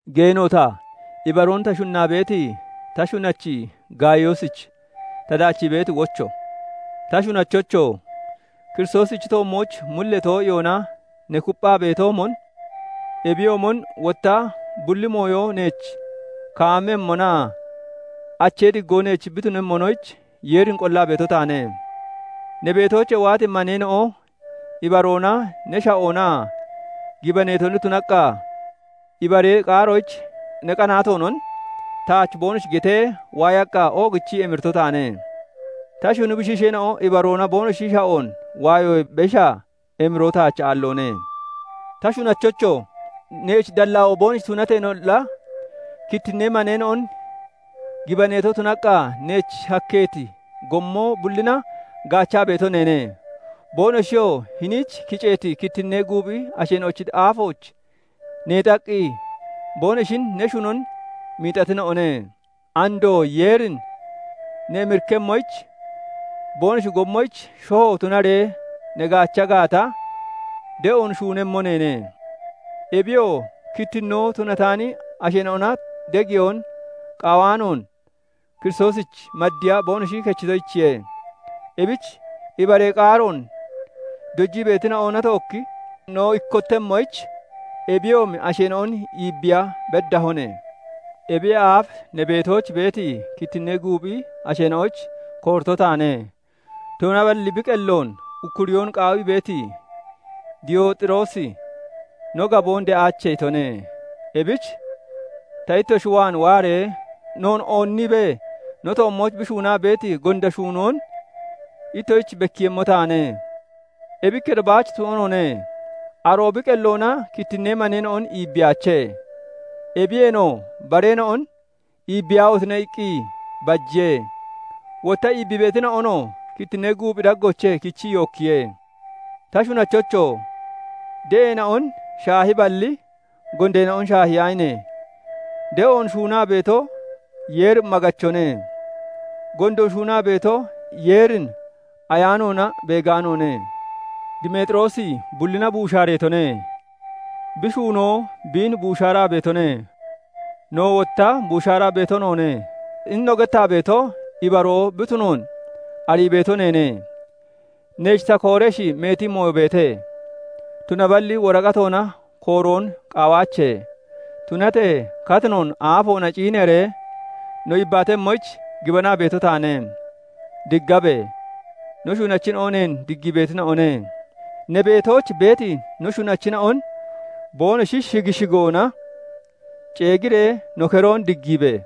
Geeno ta, ibaroon ta shunnaa beeti ta shunachi Gaayoosich ta daachii beeti wocho. Ta shunachocho! Kiristoosichi toommooch mullee too'iyoona ne kupphaa beetoomon, ebiyoomon wotta bulli mooyo neech kaamemmonaa achee diggoo neech bi tunemmonoyich Yeerin qollaa beeto taane. Ne beetoochee waati maneena'o ibaroona ne sha'oonaa gibaneeto tunaqqa ibaree qaaroyich ne qanaatoonon taach boonoshi getee waayaqqa oogichii emirito taane. Ta shuni bushiisheena'o ibaroona boonoshi sha'oon waayoyee besha emiroo taach aalloone. Ta shunachocho! Neech dallaawoo boonoshi tunateenolla, kittinnee maneena'on gibaneeto tunaqqa neech hakkeeti gommo bullina gaachaa beeto neene. Boonoshiyoo hiniich kiceeti kittinnee guuphi asheena'ochi aafooch neexaqqi boonoshin ne shunon miixatina'one. Andoo Yeerin ne emirikkemmoyich, boonoshi gommoyich shoho tunaree ne gaacha gaata, de'oon shuunemmo neene. Ebiyoo, kittinnoo tunataani asheena'ona degeyoon qaawaanoon, Kiristoosich maddiya boonoshi kechitoyichiye. Ebich ibaree qaaroon dojii beetina'ona tookki no ikkottemmoyich, ebiyoomi asheena'on iibbiya beddahone. Ebiyee aaf ne beetooch beeti kittinnee guuphi asheena'oyich koorito taane; tunaballi bi qelloon ukkuriyoon qaawii beeti Diyoxiroosi no gaboon de'aache itone. Ebich, ta ittoshi waan waaree noon oonniibee no toommooch bi shuunaa beeti gonda shuunoon ittoshich bekkiiyemmo taane. Ebi ikketo baach toonoone. Aroo bi qelloona kittinnee maneena'on iibbiyaache; ebiyeenoo bareena'on "Iibbiyaahotine!" iqqi bajiye; wotta iibbii beetina'onoo kittinnee guuphi daggoochee kichii yookkiye. Ta shunachocho! De'eena'on shaahiballi, gondeena'on shaahiyaahine! De'oon shuunaa beeto Yeer maggachone; gondoon shuunaa beeto Yeerin ayaanoona beegaanoone. Demexiroosi bullina buushaareetone; bi shuunoo biin buushaaraa beetone. No wotta buushaaraa beeto noone; hini no gettaa beeto ibaroo bi tunoon arii beeto neene. Neech ta kooreshi meeti mooyo beete; tunaballi woriqatoona kooroon qaawaache. Tunatee katinoon aafoona ciineeree no yibbaatemmoyich gibanaa beeto taane. Diggabe! No shunachina'o neen diggii beetina'one. Ne beetooch beeti no shunachina'on boonoshi shigi shigoona ceegiree no keroon diggiibe!